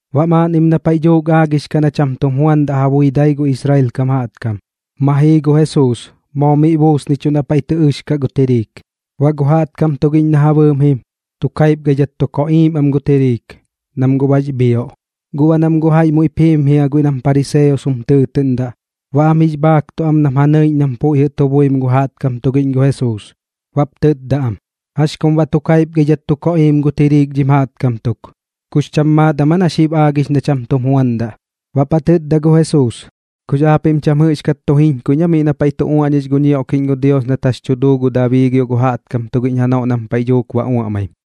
Baꞌ maaꞌnnim na paiꞌ dhuuk aagix kaꞌ na cham tum juandaꞌ ja bui gu dai Israel kam jaꞌtkam, ma jii gu Jesuus, moo miꞌ buusnichuꞌ na paiꞌ tɨ ɨx kaꞌ gu tiriik. Baꞌ gu jaꞌtkam tugiꞌñ na ja bɨɨm mu jim, tu kaipgaidhat tu koꞌiim am gu tiriik, nam guꞌ bax bhioꞌ. Guꞌ baꞌ nam guꞌ jaiꞌ muiꞌp jiim jia guiꞌ nam pariseos jum tɨɨtɨꞌndaꞌ, baꞌ am jix bhaaktuꞌ am nam ja nɨiꞌñ nam puiꞌ jɨꞌ tu buim gu jaꞌtkam tugiꞌñ gu Jesuus, baꞌp tɨtda am: ―¿Jax kum baꞌ tu kaipgaidhat tu koꞌiim gu tiriik dhim jaꞌtkam tuk? ¿Kux cham maat am aa na xib aagix na cham tum juandaꞌ? Baꞌp ja tɨtda gu Jesuus: ―¿Kux aapiꞌm cham jɨꞌxkat tu jiñkuiꞌñ aa miꞌ na paiꞌ tu uaꞌñix gu ñioꞌkiꞌñ gu Dios nat jax tu duu gu Dabii gio gu jaꞌtkam tugiꞌñ janoꞌ nam paiꞌ dhuuk ba uaꞌmaim?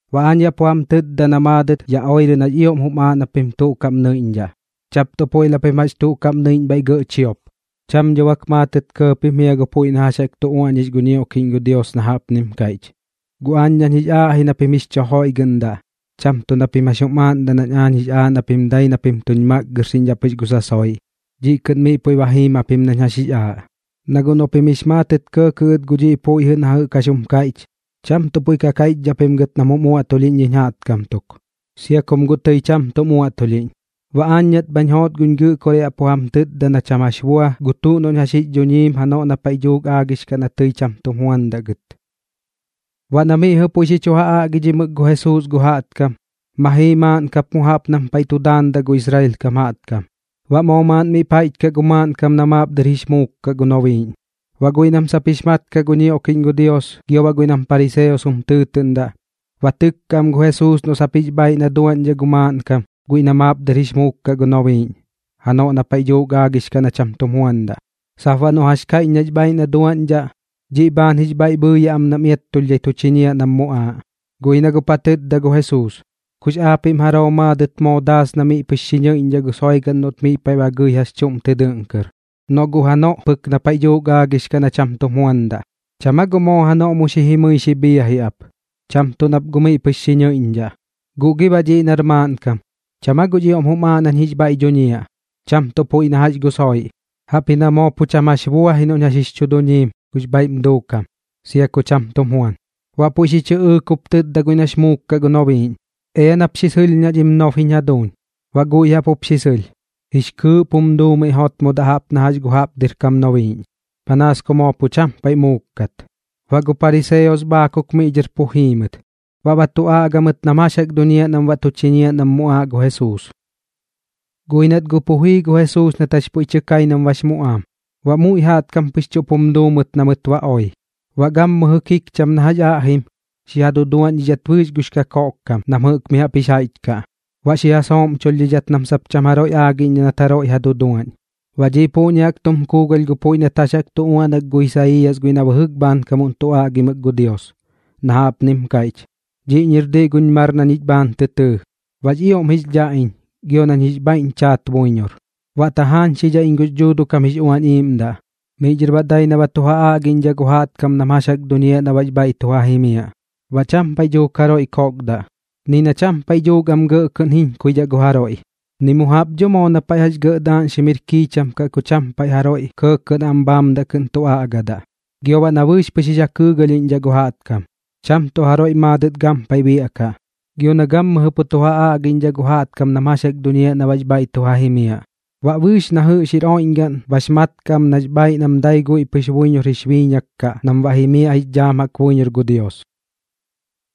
Baꞌ aañ yaꞌ pu jam tɨtda na maadɨt ya oirɨ nax ioꞌm jum aaꞌ na pim tuꞌ kaꞌm nɨiꞌñdhaꞌ, cham tuꞌ puiꞌ na pim jax tuꞌ kaꞌm tɨ nɨiꞌñ bhaiꞌ gɇꞌ chiop. Cham dho bak maatɨt kɇɇ pim jia gu puiꞌ na jax jaꞌk tu uaꞌñix gu ñioꞌkiꞌñ gu Dios na jaꞌpnim kaiꞌch: “Guꞌ aañ nañ jix aaꞌ ji na pim jix chu joiꞌgɨꞌndaꞌ, cham tuꞌ na pim jax jum aaꞌndaꞌ nañ aañ jix aaꞌ na pim dai na pim tuñ makgɨrxiꞌñdhaꞌ pɨx gu tuꞌ sasoiꞌ, dhiꞌ kɨꞌn miꞌ puiꞌ ba jiim japim nañ jax jix aaꞌ.” Na guꞌ noꞌ pim jix maatɨt kɇɇkɇꞌ gɨt gu dhiꞌ puiꞌ jɨꞌ na jax jaꞌk jum kaiꞌch, cham tuꞌ puiꞌ kaiꞌchdhaꞌ pim gɨt nam jum uaꞌtulhiꞌñ dhiñ jaꞌtkam tuk, sia kum guꞌ tɨi cham tuꞌm uaꞌtulhiꞌñ. Baꞌ aañ nat bhañ joot guñ Gɨꞌkoraꞌ yaꞌ pu jam tɨtda na cham jax bua gu tuꞌ noꞌñ jax jix dhuñiim janoꞌ na paiꞌ dhuuk aagix na tɨi cham tum juandaꞌ gɨt. Baꞌ na miꞌ jɨꞌ puiꞌ xi chu ja aꞌgidhimɨk gu Jesuus gu jaꞌtkam, ma jii maaꞌn kap mu jaꞌp nam paiꞌ tu daandaꞌ gu Israel kam jaꞌtkam. Baꞌ moo maaꞌn miꞌp jaiꞌch kaꞌ gu maaꞌnkam na maap dɨr jix muuk kaꞌ gu nobiiꞌñ. Baꞌ guiꞌ nam sap jix mat kaꞌ gu ñioꞌkiꞌñ gu Dios gio baꞌ guiꞌ nam pariseos jum tɨɨtɨꞌndaꞌ, ba tɨkkaꞌ am gu Jesuus noꞌ sap jix bhaaiꞌ na duaꞌñdhaꞌ gu maaꞌnkam guiꞌ na maap dɨr jix muuk gu nobiiꞌñ janoꞌ na paiꞌ dhuuk aagix na cham tum juandaꞌ, sap baꞌ noꞌ jax kaiꞌch nax bhaaiꞌ na duaꞌñdhaꞌ, dhiꞌ bhaan jix bhaiꞌ bhɨɨyaꞌ am nam iattulhdhai tu chiñiaꞌ nam muꞌaaꞌ. Guꞌ ji na guꞌp ja tɨtda gu Jesuus: ―¿Kux aapiꞌm jaroo maadɨt moo daas na miꞌ pɨx xi nɨiꞌñdhaꞌ gu soigaꞌn noꞌt miꞌ paiꞌ ba gɨi jax chuꞌm tɨ dɨꞌn kɨr, noꞌ guꞌ janoꞌ pɨk na paiꞌ dhuuk aagix na cham tum juandaꞌ? ¿Cham aa guꞌ moo janoꞌ mu jimɨi xi bhiaji ap, cham tuꞌ nap guꞌ miꞌ pɨx xi nɨiꞌñdhaꞌ? Guꞌ gi baꞌ dhiꞌ nar maaꞌnkam, ¿cham aa guꞌx ioꞌm jum aaꞌ nañ jix bhaiꞌ dhuñiaꞌ, cham tuꞌ puiꞌ na jax gu tuꞌ soiꞌ? Jaꞌpji na moo pu cham jax bua ji noꞌñ jax jix dhuñiim gux bhaiꞌm duukam, sia ku cham tum juan. Baꞌ puiꞌ xi chɨꞌɨɨk jup tɨtda guiꞌ nax muuk kaꞌ gu nobiiꞌñ: ―Ea nap xi sɨlhñaꞌ dhim nob jiñ jaduuñ. Baꞌ guiꞌ jaꞌp jup xi sɨlh, jix kɨɨꞌp jum duu miꞌ jotmodaꞌ jaꞌp na jax gu jaꞌp dɨr kam nobiiꞌñ, panaas ku moo pu cham paiꞌ muuk kat. Baꞌ gu pariseos bhaakuk miꞌ dhɨr pu jii mɨt, baꞌ ba tu aꞌga mɨt nam jax jaꞌk duñiaꞌ nam baꞌ tu chiñiaꞌ nam muꞌaaꞌ gu Jesuus. Guꞌ ji nat guꞌ pu jii gu Jesuus nat jax puiꞌ tɨ kai nam bax muꞌaam, baꞌ muiꞌ jaꞌtkam pɨx chuꞌp jum duu mɨt na mɨt ba oi. Baꞌ gammɨjɨ kikcham na jax aꞌjim, xi ja duduaꞌñdhidhat bɨɨx gux kakoꞌk kam nam jɨꞌk mi jaꞌp jix jaiꞌch kaꞌ. Baꞌ xi ja sooꞌmchulhdhidhat nam sap cham jaroiꞌ aagiꞌñdhaꞌ nat jaroiꞌ ja duduaꞌñ. Baꞌ dhiꞌ puꞌñi jaꞌk tum kuugalh gu puiꞌ nat jax jaꞌk tu uaꞌnak gu Isaiiyas guiꞌ na bɨjɨk bhaankam tu aꞌgimɨk gu Dios, na jaꞌpnim kaiꞌch: Dhiꞌñi jir diꞌ guñ mar na ñich bhaan tɨ tɨɨ, baꞌx ioꞌm jix dhaꞌ iñ gio nañ jix bhaiꞌñ chaat buiñor. Baꞌ tajaañxidhaꞌ iñ gux Dhuuduꞌ kam jix Uañ jiñ Iiꞌmdaꞌ, miꞌ dhɨr baꞌ dai na ba tu ja aagiꞌñdhaꞌ gu jaꞌtkam nam jax jaꞌk duñiaꞌ na baꞌx bhaiꞌ tu ja jimiaꞌ. Baꞌ cham paiꞌ dhuuk jaroiꞌ kokdaꞌ, ni na cham paiꞌ dhuuk am gɇꞌ kɨꞌn jiñkuiꞌñdhaꞌ gu jaroiꞌ, ni mu jaꞌp dho moo na paiꞌ jax gɇꞌ daaꞌñxim jir kiicham kaꞌ ku cham paiꞌ pɨx am jaroiꞌ kɇɇkɇꞌ na am bhaamdaꞌ kɨꞌn tu aꞌgadaꞌ. Gio baꞌ na bɨɨx pɨx jix ja kɨɨgalhiꞌñdhaꞌ gu jaꞌtkam, cham tuꞌ jaroiꞌ maadɨt gampaiꞌ biaꞌkaꞌ. Gio na gammɨjɨ pu tu ja aagiꞌñdhaꞌ gu jaꞌtkam nam jax jaꞌk duñiaꞌ na baꞌx bhaiꞌ tu ja jimiaꞌ. Baꞌ bɨɨx na jɨꞌx jir oiꞌñgaꞌn bax mat kaꞌ am nax bhaaiꞌ nam dai guiꞌ buiñor pɨx jix biiñak kaꞌ nam baꞌ jimiaꞌ jix dhaam jaꞌk buiñor gu Dios.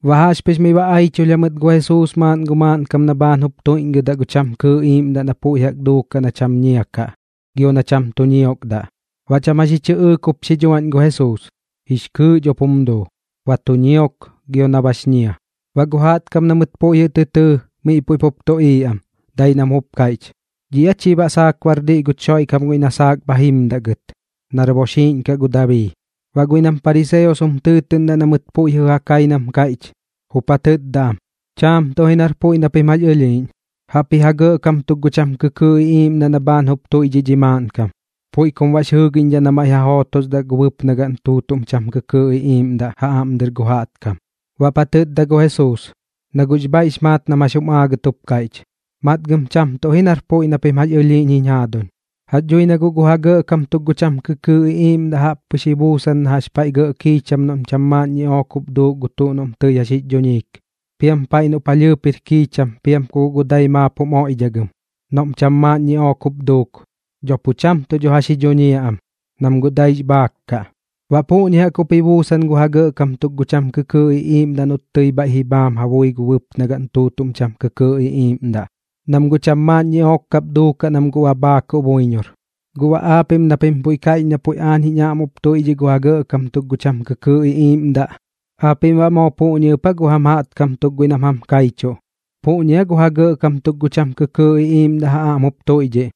Baꞌ jaꞌxpɨx miꞌ ba aiꞌchulh jamɨt gu Jesuus maaꞌn gu maaꞌnkam na bhaan jup tuiꞌñgɨdaꞌ gu cham kɨɨꞌ iiꞌmdaꞌ na puiꞌ jaꞌk duukaꞌ na cham ñia kaꞌ gio na cham tu ñiokdaꞌ. Baꞌ cham jax ji chɨꞌɨɨk jup xi dhuaꞌñ gu Jesuus, jix kɨɨꞌ dho guꞌp jum duu, ba tu ñiok gio na bax ñia. Baꞌ gu jaꞌtkam na mɨt puiꞌ jɨꞌ tɨ tɨɨ, miꞌ puiꞌ pup tuꞌiiꞌ am, dai nam jup kaiꞌch: ―¿Dhiꞌ aa chi baꞌ saak bar diꞌ guch Xoiꞌkam guiꞌ na saak bha jimdaꞌ gɨt, nar boxiiꞌñ kaꞌ gu Dabii? Baꞌ guiꞌ nam pariseos jum tɨɨtɨꞌndaꞌ na mɨt puiꞌ jɨꞌ ja kai nam kaiꞌch, jup ja tɨtda am: ―Chaam tuꞌ ji nar puiꞌ na pim jax ɨlhiiꞌñ. Jaꞌpji ja gɇꞌkam tuk ji gu cham kɨkɨɨꞌ iꞌiiꞌmdaꞌ na bhaan jup tuiꞌdhiꞌ dhi maaꞌnkam. Puiꞌ kum baꞌx jɨɨgiꞌñdhaꞌ na maiꞌ ja jootosdaꞌ gu bɨpnagaꞌn tuutuꞌm cham kɨkɨɨꞌ iꞌiiꞌmdaꞌ ja aꞌm dɨr gu jaꞌtkam. Baꞌp ja tɨtda gu Jesuus, na guꞌx bhaiꞌx maat nam jax jum aagɨt jup kaiꞌch: ―Matgɨm cham tuꞌ ji nar puiꞌ na pim jax ɨlhiiꞌñ jiñ jaaduñ. Jax dhui na guꞌ gu ja gɇꞌkam tuk gu cham kɨkɨɨꞌ iꞌiiꞌmdaꞌ jaꞌp pɨx ji buusan na jax paiꞌ gɇꞌ kiicham noꞌm cham maaꞌn ñiꞌook jup duuk gu tuꞌ noꞌm tɨi jax jix dhuñiik. Piam paiꞌ noꞌ palhɨɨp jir kiicham piam ku guꞌ gu dai maap jum oiꞌdhagɨm, noꞌm cham maaꞌn ñiꞌook jup duuk, dho pu cham tuꞌ dho jax ji dhuñiaꞌ am, nam guꞌ daix bhaak kaꞌ. Baꞌ puꞌñi jaꞌk jup ji buusan gu ja gɇꞌkam tuk gu cham kɨkɨɨꞌ iꞌiiꞌmdaꞌ noꞌt tɨi bhaiꞌ ji bhaam ja bui gu bɨpnagaꞌn tuutuꞌm cham kɨkɨɨꞌ iꞌiiꞌmdaꞌ, nam guꞌ cham maaꞌn ñiꞌook kap duukaꞌ nam guꞌ ba bhaakuꞌ buiñor. Guꞌ baꞌ aapiꞌm na pim puiꞌ kaiꞌch na puiꞌ aañ jiñ aꞌm jup tuiꞌdhiꞌ gu ja gɇꞌkam tuk gu cham kɨkɨɨꞌ iꞌiiꞌmdaꞌ, ¿aapiꞌm baꞌ moo puꞌñi ɨp aa gu jam jaꞌtkam tuk guiꞌ nam jam kaichuꞌ, puꞌñi aa ja gɇꞌkam tuk gu cham kɨkɨɨꞌ iꞌiiꞌmdaꞌ ja aꞌm jup tuiꞌdhiꞌ,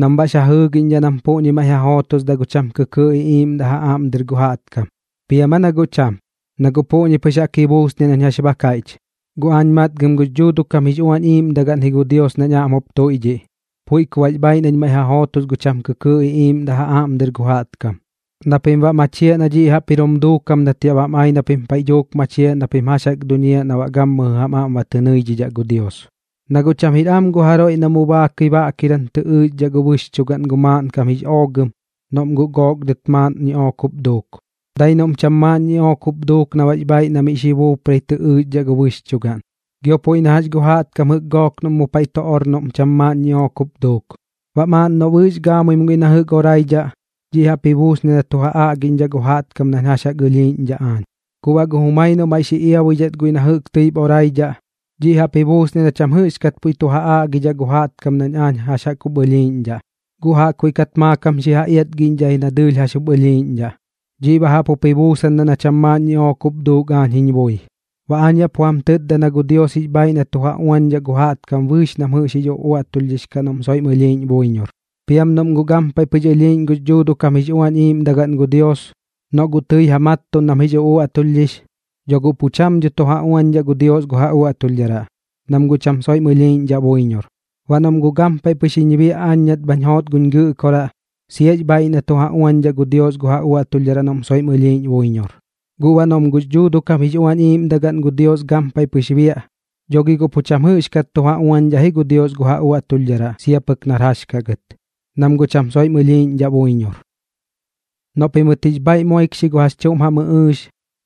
nam baꞌx ja jɨɨgiꞌñdhaꞌ nam puꞌñi maiꞌ ja jootosdaꞌ gu cham kɨkɨɨꞌ iꞌiiꞌmdaꞌ ja aꞌm dɨr gu jaꞌtkam? ¿Piam aa na guꞌ cham? Na guꞌ puꞌñi pɨx jaꞌk ji buusniaꞌ nañ jax ba kaiꞌch. Guꞌ aañ matgɨm gux Dhuuduꞌ kam jix Uañ Iiꞌmdagaꞌn ji gu Dios nañ aꞌm jup tuiꞌdhiꞌ, puiꞌ ku baꞌx bhaaiꞌ nañ maiꞌ ja jootos gu cham kɨkɨɨꞌ iꞌiiꞌmdaꞌ ja aꞌm dɨr gu jaꞌtkam, na pim baꞌ ba machiaꞌ na dhiꞌ jaꞌp jir jup duukam nat yaꞌ bam ai na pim paiꞌ dhuuk machiaꞌ na pim jax jaꞌk duñiaꞌ na baꞌ gammɨjɨ jam aꞌm ba tɨ nɨiꞌñdhaꞌ gu Dios. ’Na guꞌ cham jir am gu jaroiꞌ na mu baakɨi baꞌkiram tɨ ɨɨxdhaꞌ gu bɨxchugaꞌn gu maaꞌnkam jix oogɨm noꞌm guꞌ gook dɨt maaꞌn ñiꞌook jup duuk. Dai noꞌm cham maaꞌn ñiꞌook jup duuk na baꞌx bhaaiꞌ na xi buuprai tɨ ɨxdhaꞌ gu bɨxchugaꞌn. ’Gio puiꞌ na jax gu jaꞌtkam jɨꞌk gook noꞌm mu paiꞌ tu or noꞌm cham maaꞌn ñiꞌook jup duuk. Baꞌ maaꞌn noꞌ bɨɨx gaamuim guiꞌ na jɨꞌk oraidhaꞌ, dhiꞌ jaꞌp ji buusniaꞌ na tu ja aꞌgidhaꞌ gu jaꞌtkam nañ jax jaꞌk ɨlhiiꞌñdhaꞌ aañ. Guꞌ baꞌ gu jumai noꞌ maiꞌ xi iabuidhat guiꞌ na jɨꞌk tɨip oraidhaꞌ, dhiꞌ jaꞌp jup ji buusniaꞌ na cham jɨꞌxkat puiꞌ tu ja aꞌgidhaꞌ gu jaꞌtkam nañ aañ jax jup ɨlhiiꞌñdhaꞌ, guꞌ jaꞌkbuiꞌ kat maakam xi ja iatgiꞌñdhaꞌ ji na dɨɨlh jax jup ɨlhiiꞌñdhaꞌ. Dhiꞌ baꞌ jaꞌp jup ji buusandaꞌ na cham maaꞌn ñiꞌook jup duuk aañ jiñ bui. ’Baꞌ aañ yaꞌ pu jam tɨtda na gu Dios jix bhaaiꞌ na tu ja uañdhaꞌ gu jaꞌtkam bɨɨx nam jɨꞌk jax jix uꞌuaꞌtulhdhix kaꞌ noꞌm soiꞌm ɨlhiiꞌñ buiñor. Piam noꞌm guꞌ gampaiꞌ pɨx biaꞌ gux Dhuuduꞌ kam jix Uañ Iiꞌmdagaꞌn gu Dios, noꞌ guꞌ tɨi ja mattuꞌn nam jix uꞌuaꞌtulhdhix, dho guꞌ pu cham dho tu ja uañdhaꞌ gu Dios gu ja uaꞌtulhdharaꞌ, nam guꞌ cham soiꞌm ɨlhiiꞌñdhaꞌ buiñor. Baꞌ noꞌm guꞌ gampaiꞌ pɨx jiñ biaꞌ aañ nat bhañ joot guñ Gɨꞌkoraꞌ, siax bhaaiꞌ na tu ja uañdhaꞌ gu Dios gu ja uaꞌtulhdharaꞌ noꞌm soiꞌm ɨlhiiꞌñ buiñor. Guꞌ baꞌ noꞌm guꞌ gux Dhuuduꞌ kam jix Uañ Iiꞌmdagaꞌn gu Dios gampaiꞌ pɨx biaꞌ, dho gi guꞌ pu cham jɨꞌxkat tu ja uañdhaꞌ ji gu Dios gu ja uaꞌtulhdharaꞌ sia pɨk nar jax kaꞌ gɨt, nam guꞌ cham soiꞌm ɨlhiiꞌñdhaꞌ buiñor. ’Noꞌ pimɨt jix bhaiꞌ moikxi gu jax chuꞌm jam ɨꞌɨɨx,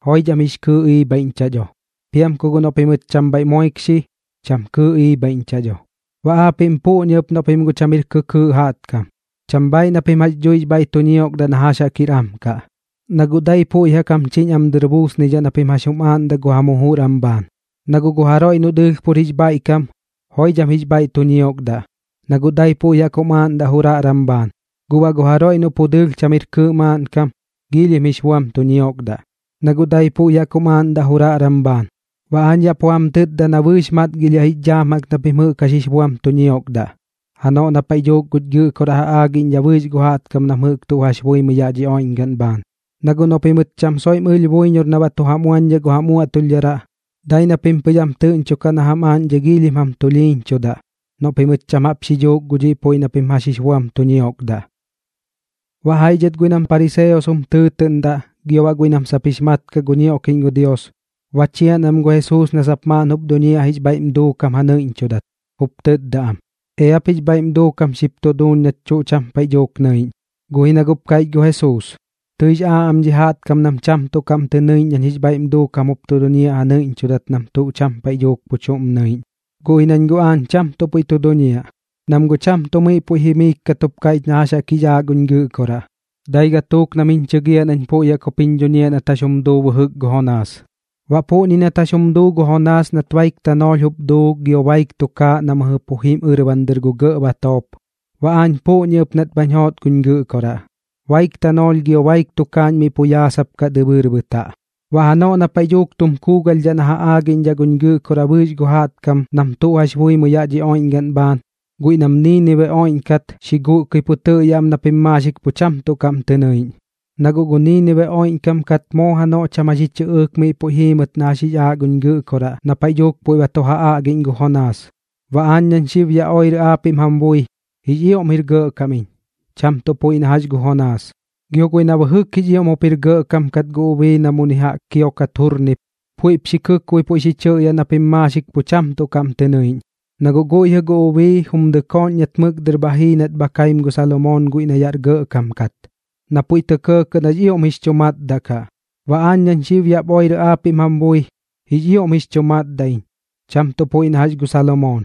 joidham jix kɨɨꞌ iꞌbhaiꞌñchaꞌ dho. Piam ku guꞌ noꞌ pimɨt cham bhaiꞌ moikxi, cham kɨɨꞌ iꞌbhaiꞌñchaꞌ dho. Baꞌ aapiꞌm puꞌñi ɨp noꞌ pim guꞌ cham jir kɨkɨɨꞌ jaꞌtkam, cham bhaaiꞌ na pim jax dhuix bhaiꞌ tu ñiokdaꞌ na jax jaꞌk jir am kaꞌ, na guꞌ dai puiꞌ jaꞌk jam chiñ am dɨr buusnidhaꞌ na pim jax jaꞌk jum aaꞌndaꞌ gu jam jujur am bhaan. Na guꞌ gu jaroiꞌ noꞌ dɨɨlh pur jix bhaiꞌkam, joidham jix bhaiꞌ tu ñiokdaꞌ, na guꞌ dai puiꞌ jaꞌk jum aaꞌndaꞌ juraꞌran bhaan. Guꞌ baꞌ gu jaroiꞌ noꞌ pu dɨɨlh cham jir kɨɨꞌ maaꞌnkam, giilhim jix buam tu ñiokdaꞌ, na guꞌ dai puiꞌ jaꞌk jup jum aaꞌndaꞌ juraꞌran bhaan. Baꞌ aañ yaꞌ pu jam tɨtda na bɨɨx matgilhiaꞌ jix dhaam jaꞌk na pim jɨꞌk jax jix buam tu ñiokdaꞌ, janoꞌ na paiꞌ dhuuk guñ Gɨꞌkoraꞌ ja aagiꞌñdhaꞌ bɨɨx gu jaꞌtkam nam jɨꞌk tuꞌ jax buimɨi yaꞌ dhi oiꞌñgaꞌn bhaan. Na guꞌ noꞌ pimɨt cham soiꞌm ɨlh buiñor na baꞌ tu jam uañdhaꞌ gu jam uaꞌtulhdharaꞌ, dai na pim pɨx am tɨꞌñchokaꞌ na jam aaꞌñdhai giilhim jam tulhiiñchudaꞌ, noꞌ pimɨt cham jaꞌp xi dhuuk gu dhiꞌ puiꞌ na pim jax jix buam tu ñiokdaꞌ. Baꞌ jaiꞌ dhɨt guiꞌ nam pariseos jum tɨɨtɨꞌndaꞌ gio baꞌ guiꞌ nam sap jix mat kaꞌ gu ñioꞌkiꞌñ gu Dios, ba chian am gu Jesuus na sap maaꞌn jup tu duñiaꞌ jix bhaiꞌm duukam ja nɨiꞌñchudat. Jup tɨtda am: ―Eap jix bhaiꞌm duukam xip duuñ nach tuꞌ cham paiꞌ dhuuk nɨiꞌñ. Guꞌ ji na guꞌp kaiꞌch gu Jesuus: ―Tɨix aaꞌ am dhi jaꞌtkam nam cham tuꞌ kaꞌm tɨ nɨiꞌñ nañ jix bhaiꞌm duukam jup tu duñiaꞌ ja nɨiꞌñchudat nam tuꞌ cham paiꞌ dhuuk pu chuꞌm nɨiꞌñ, guꞌ ji nañ guꞌ aañ cham tuꞌ puiꞌ tu duñiaꞌ, nam guꞌ cham tuꞌ miꞌ puiꞌ jimiik kat jup kaiꞌch na jax jix aaꞌ guñ Gɨꞌkoraꞌ. Dai gatuuk nam jiñ chɨgiaꞌ nañ puiꞌ jaꞌk jup jiñ dhuñiaꞌ nat jax jum duu bɨjɨk gu Jonaas. Baꞌ puꞌñi nat jax jum duu gu Jonaas nat baik tanoolh jup duu gio baik tukaaꞌ na mɨjɨ pu jim ɨrban dɨr gu gɇꞌ batoop, baꞌ aañ puꞌñi ɨp nat bhañ joot guñ Gɨꞌkoraꞌ, baik tanoolh gio baik tukaaꞌñ miꞌ pu yaasapkaꞌ dɨbɨɨr bɨtaꞌ. Baꞌ janoꞌ na paiꞌ dhuuk tum kuugalhdhaꞌ na ja aagiꞌñdhaꞌ guñ Gɨꞌkoraꞌ bɨɨx gu jaꞌtkam nam tuꞌ jax buimɨi yaꞌ dhi oiꞌñgaꞌn bhaan, guiꞌ nam Niinibe oiꞌñkat xi guꞌkɨi pu tɨꞌyaꞌ am na pim maaxik pu cham tuꞌ kaꞌm tɨ nɨiꞌñ. Na guꞌ gu Niinibe oiꞌñkam kat moo janoꞌ cham jax ji chɨꞌɨɨk miꞌ puiꞌ jii mɨt na jax jix aaꞌ guñ Gɨꞌkoraꞌ na paiꞌ dhuuk puiꞌ ba tu ja aꞌgiꞌñ gu Jonaas. Baꞌ aañ nañ xib yaꞌ oirɨ aapiꞌm jam bui, jix ioꞌm jir gɇꞌkam iñ, cham tuꞌ puiꞌ na jax gu Jonaas. Gio guiꞌ na bɨjɨk jix ioꞌm jup jir gɇꞌkam kat gu ubii na muni jaꞌk kiokat jurnip, puiꞌp xi kɨkboi puiꞌ xi chɨꞌyaꞌ na pim maaxik pu cham tuꞌ kaꞌm tɨ nɨiꞌñ. Na guꞌ guiꞌ jɨꞌ gu ubii jum dɨkooꞌñ nat mɨk dɨr bha jii nat bha kaim gu Salomoon guiꞌ na yaꞌr gɇꞌkam kat, na puiꞌ tɇ kɇɇkɇꞌ nax ioꞌm jix chu matdaꞌ kaꞌ. Baꞌ aañ nañ xib yaꞌ oirɨ aapiꞌm jam bui, jix ioꞌm jix chu matdaꞌ iñ, cham tuꞌ puiꞌ na jax gu Salomoon.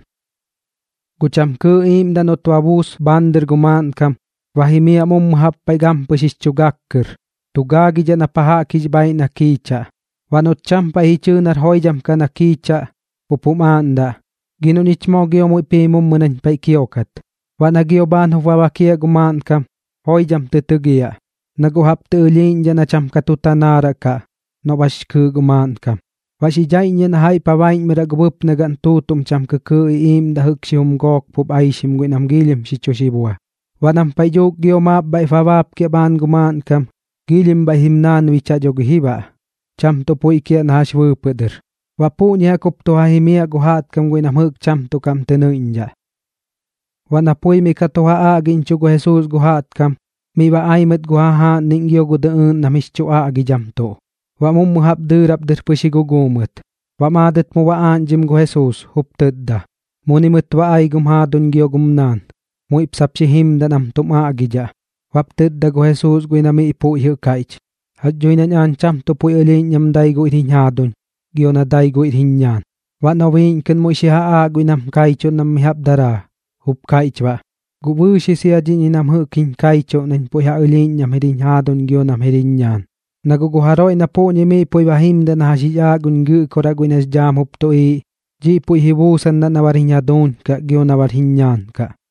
’Gu cham kɨɨꞌ iiꞌmdaꞌ noꞌt ba buus bhaan dɨr gu maaꞌnkam, ba jimiaꞌ mummɨ jaꞌp paiꞌ gampɨx jix chu gak kɨr, tu gaagidhaꞌ na pa jaꞌk jix bhaaiꞌ na kiichaꞌ. Baꞌ noꞌt cham paiꞌ ji chɨɨ nar joidham na kiichaꞌ, jup jum aaꞌndaꞌ: “Gi noꞌ ñich moo gio muiꞌp jii mummɨ nañ paiꞌ kiokat.” Baꞌ na gio bhaan jup ba bakiaꞌ gu maaꞌnkam, joidham tɨ tɨgiaꞌ, na guꞌ jaꞌp tɨ ɨlhiiꞌñdhaꞌ na cham ka tu tanaaraꞌ kaꞌ noꞌ bax kɨɨꞌ gu maaꞌnkam. Baꞌ xi dhaiꞌññiaꞌ na jaiꞌp ja baiꞌñmɨraꞌ gu bɨpnagaꞌn tuutuꞌm cham kɨkɨɨꞌ iꞌiiꞌmdaꞌ jɨꞌk xijum gook pup aixim guiꞌ nam giilhim xi chu xibua. Baꞌ nam paiꞌ dhuuk gio maap bhaiꞌp ba baapkiaꞌ bhaan gu maaꞌnkam, giilhim bhaiꞌ jim naanbichaꞌ dho gi ji baꞌ, cham tuꞌ puiꞌ kiaꞌ na jax bɨɨpɨꞌ dɨr. Baꞌ puꞌñi jaꞌk jup tu ja jimiaꞌ gu jaꞌtkam guiꞌ nam jɨꞌk cham tuꞌ kaꞌm tɨ nɨiꞌñdhaꞌ. Baꞌ na pui miꞌ ka tu ja aꞌgiꞌñchuꞌ gu Jesuus gu jaꞌtkam, miꞌ ba ai mɨt gu jajaaꞌnniꞌñ gio gu dɨꞌɨɨꞌn nam jix chu aꞌgidhamtuꞌ, baꞌ mummɨ jaꞌp dɨɨrap dɨr pɨx ji guguu mɨt. Baꞌ maadɨt mu ba aaꞌñdhim gu Jesuus, jup tɨtda: ―Muni mɨt ba ai gum jaaduñ gio gum naan. Muiꞌp sap xi jimdaꞌ nam tum aꞌgidhaꞌ. Baꞌp tɨtda gu Jesuus guiꞌ na miꞌ puiꞌ jɨꞌ kaiꞌch: ―Jax dhui nañ aañ cham tuꞌ puiꞌ ɨlhiiꞌñ nam dai guiꞌr jiñ jaaduñ gio na dai guiꞌr jiñ ñaan. Baꞌ nobiiꞌñ kɨꞌn muiꞌ xi ja aaꞌ guiꞌ nam kaichuꞌ nam mi jaꞌp daraa, jup kaiꞌch baꞌ: ―Guꞌ bɨɨx ji sia dhiꞌñi nam jɨꞌk jiñ kaichuꞌ nañ puiꞌ ja ɨlhiiꞌñ nam jir jiñ jaaduñ gio nam jir jiñ ñaan. Na guꞌ gu jaroiꞌ na puꞌñi miꞌ puiꞌ ba jimdaꞌ na jax jix aaꞌ guñ Gɨꞌkoraꞌ guiꞌ nax dhaam jup tuꞌiiꞌ, dhiꞌ puiꞌ ji buusandaꞌ na bar jiñ jaaduñ kaꞌ gio na bar jiñ ñaan kaꞌ.